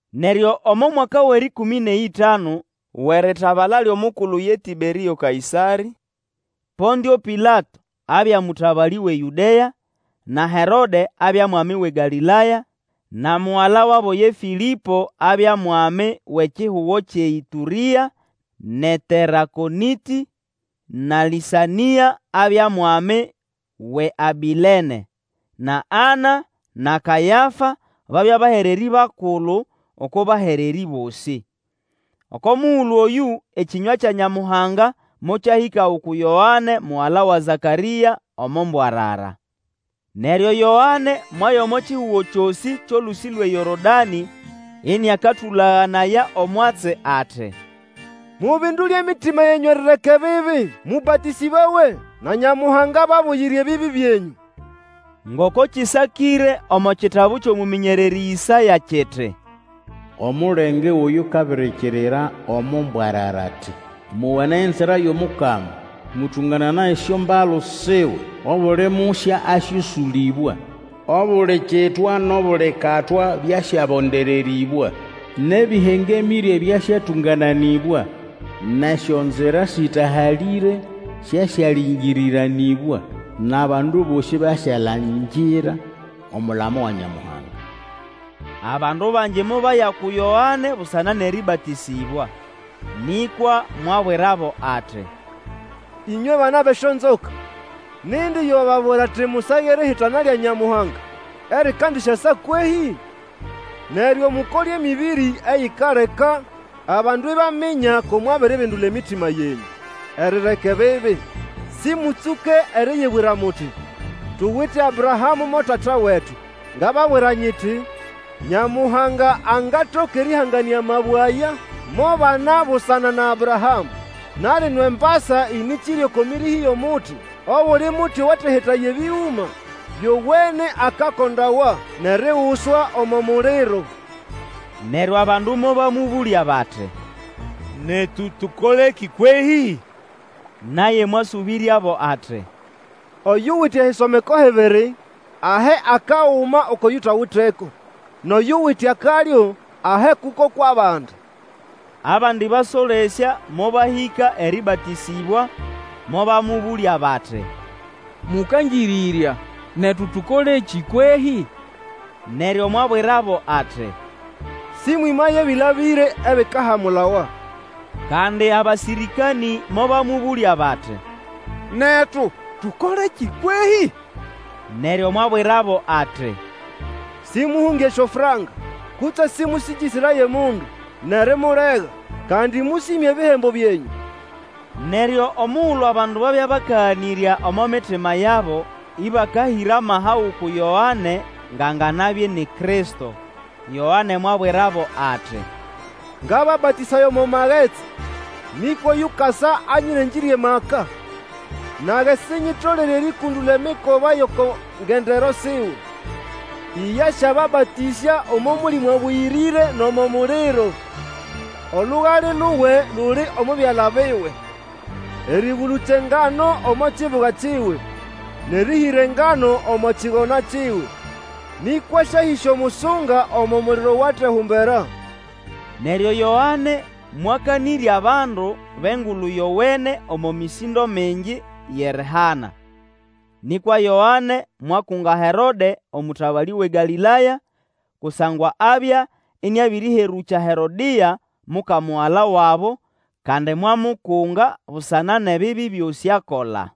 Neryo omo mwaka wʼerĩkũmĩ nʼeyĩtanu wʼeritabala lyʼomukulu ye Tĩberĩo Kaĩsarĩ, Pontĩo Pilato abya mũtabalĩ wʼeYũdea, na Herode abya mwami wʼeGalĩlaya, na mugala wabo ye Fĩlĩpo abya mwami wʼekihugo kyʼeĨtũrĩa nʼeTerakonĩtĩ, na Lĩsanĩa abya mwami wʼeAbĩlene, na Ana na Kayafa babya bahererĩ bakulu oko bahererĩ bosĩ. Oko mugulu oyũ ekĩnywa kya Nyamuhanga mokyahĩka uku Yoane mugala wa Zakarĩa, omo mbwarara. Neryo Yoane mwaya omo kihugo kyosĩ kyʼolũsĩ lwʼeYorodanĩ ĩnĩakatũlaganaya omwatsi, ati, Mubindule emitima yenyũ erireka ebibi, mũbatĩsĩbawe, na Nyamuhanga ababuyire ebibi byenyũ. Ngoko kĩsakĩre omo kitabu kyʼomũmĩnyererĩ Ĩsaya kiti, Omulenge wʼoyukabirikirira omo mbwarara, ati, Mowanaye enzira yʼomukama, Mũtũngananaye esyombalu siwe. Obuli musya asyosũlĩbwa, Obuli kitwa nʼobuli katwa byasyabondererĩbwa; Nʼebĩhengemĩre byasyatũngananĩbwa; Nʼesyonzira sĩtahalĩre syasyalĩngĩrĩranĩbwa; Nʼabandu bosĩ basyalangira omulamo wa Nyamuhanga. Abandu bangi mobaya uku Yoane busana nʼerĩbatĩsĩbwa. Nĩkwa mwabwirabo, ati, Ĩnywe bana bʼesyonzoka! Nindi yo wababwira ati musage erihitana lya Nyamuhanga erikandisyasa kwehĩ? Neryo mukole emĩbĩrĩ eyikaleka abandu ibaminya ko mwabiribindula emitima yenyũ erireka ebibi. Sĩmũtsũke eriyibwira muti, Tuwite Abrahamũ mo tata wetu. Ngababwira nyiti, Nyamuhanga angatoka erĩhanganĩa amabwe aya mo bana busana na Abrahamũ. Na lino embasa ĩnĩkĩrye oko mĩrĩhĩ yʼomuti, obuli muti owatehetaya ebĩgũma byowene akakondawa nʼeriguswa omo muliro. Neryo abandu mobamũbũlya bati, Netu tũkolekĩ kwehĩ? Naye mwasũbĩryabo ati, Oyuwite ehisomeko hibiri, ahe akaguma oko yutawiteko, nʼoyuwite akalyo ahe kuko kwʼabandi. Abandi basolesya mobahĩka erĩbatĩsĩbwa, mobamũbũlya bati, Mũkangĩrĩrya, netu tũkolekĩ kwehĩ? Neryo mwabwirabo ati, Sĩmwĩmaye ebĩlabĩre ebikahamulawa. Kandi abasĩrĩkanĩ mobamũbũlya bati, Netu, tũkolekĩ kwehĩ? Neryo mwabwirabo ati, Sĩmũhũnge esyofranka, kutse sĩmũsĩngĩsĩraye omundu nʼerimulega, kandi mũsĩme ebihembo byenyũ. Neryo omugulu abandu babya bakaganĩrya omo mitima yabo ĩbakahĩra amaha uku Yoane ngʼanganabya ini Kristo, Yoane mwabwirabo ati, Ngababatĩsaya omo magetsi, nĩkwa oyukasa anyĩrengĩrye amaka, nage sinyitolere erĩkũndũla emikoba yʼoko ngendero siwe. Iye asyababatĩsya omo Mũlĩmũ Abũyĩrĩre nʼomo muliro. Olugale luwe luli omo byala biwe, erĩgũlũkya engano omo kibuga kiwe, nʼerĩhĩra engano omo kigona kiwe; nĩkwa asyahĩsya omusunga omo muliro owatehumbera. Neryo Yoane mwakanĩrya abandu bʼEngulu Yowene omo mĩsĩndo mingi yʼerihana. Nĩkwa Yoane mwakunga Herode omũtabalĩ wʼeGalĩlaya, kusangwa abya ĩnĩabĩrĩherũkya Herodĩa, muka mugala wabo, kandi mwamukunga busana nʼebibi byosĩ akola.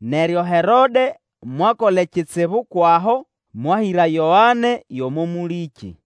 Neryo Herode mwakola ekitsibu kwʼaho, mwahĩra Yoane yʼomo mũlĩkĩ.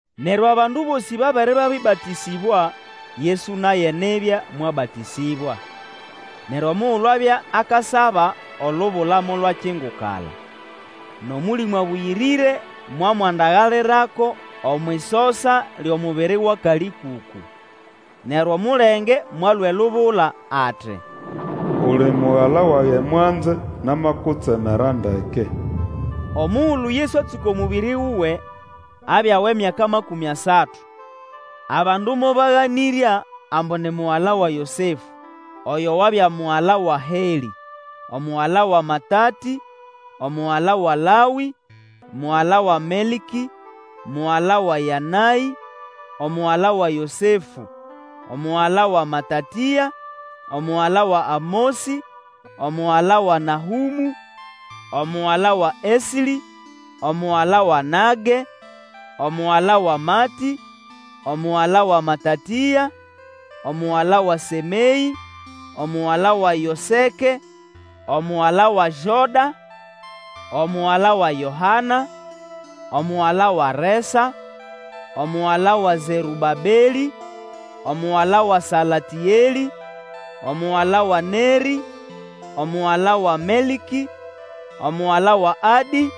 Neryo abandu bosĩ babere babĩbatĩsĩbwa, Yesu naye nibya mwabatĩsĩbwa. Neryo omugulu abya akasaba olubula molwakingukala, nʼOmũlĩmũ Abũyĩrĩre mwamwandagalirako omwʼisosa lyʼomubiri wʼakalĩkũkũ. Neryo omulenge mwalũa elubula ati, Uli Mugala wage mwanze, namakutsemera ndeke. Omugulu Yesu atsũka omũbĩrĩ wuwe, abya wʼemyaka makũmĩ asatu; abandu mobaganĩrya, ambu ni mugala wa Yosefũ, oyo wabya mugala wa Helĩ, omugala wa Matatĩ, omugala wa Lawĩ, omugala wa Melkĩ, omugala wa Yanaĩ, omugala wa Yosefũ, omugala wa Matatĩa, omugala wa Amosĩ, omugala wa Nahũmũ, omugala wa Eslĩ, omugala wa Nage, omugala wa Matĩ, omugala wa Matatĩa, omugala wa Sĩmeĩ, omugala wa Yoseke, omugala wa Joda, omugala wa Yohana, omugala wa Resa, omugala wa Zerũbabelĩ, omugala wa Salatĩelĩ, omugala wa Nerĩ, omugala wa Melkĩ, omugala wa Adĩ,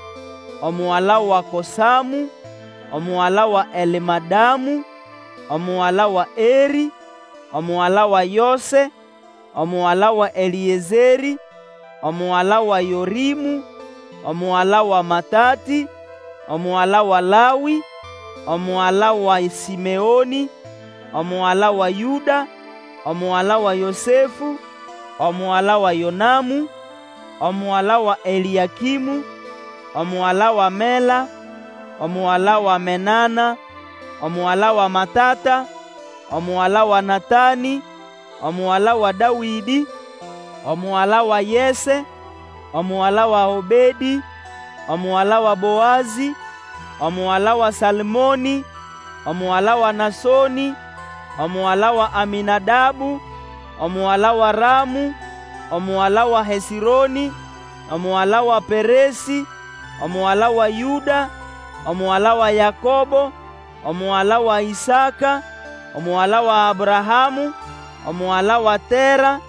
omugala wa Kosamũ omugala wa Elmadamu, omugala wa Erĩ, omugala wa Yose, omugala wa Elĩezerĩ, omugala wa Yorĩmũ, omugala wa Matatĩ, omugala wa Lawĩ, omugala wa Sĩmeonĩ, omugala wa Yũda, omugala wa Yosefũ, omugala wa Yonamũ, omugala wa Elĩakĩmũ, omugala wa Mela, omugala wa Menana, omugala wa Matata, omugala wa Natanĩ, omugala wa Dawĩdĩ, omugala wa Yese, omugala wa Obedĩ, omugala wa Boazĩ, omugala wa Salmonĩ, omugala wa Nasonĩ, omugala wa Amĩnadabu, omugala wa Ramũ, omugala wa Hesĩronĩ, omugala wa Peresĩ, omugala wa Yũda, omugala wa Yakobo, omugala wa Ĩsaka, omugala wa Abrahamũ, omugala wa Tera,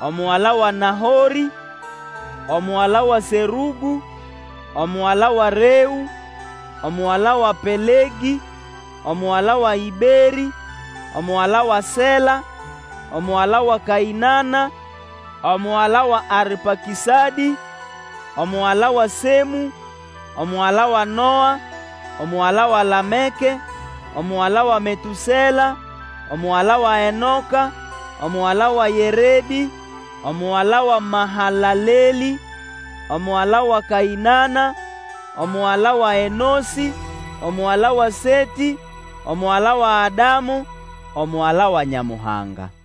omugala wa Nahorĩ, omugala wa Serũgũ, omugala wa Reũ, omugala wa Pelegĩ, omugala wa Ĩberĩ, omugala wa Sela, omugala wa Kaĩnana, omugala wa Arpakĩsadĩ, omugala wa Semũ, omugala wa Noa, omugala wa Lameke, omugala wa Metũsela, omugala wa Enoka, omugala wa Yeredĩ, omugala wa Mahalalelĩ, omugala wa Kaĩnana, omugala wa Enosĩ, omugala wa Setĩ, omugala wa Adamu, omugala wa Nyamuhanga.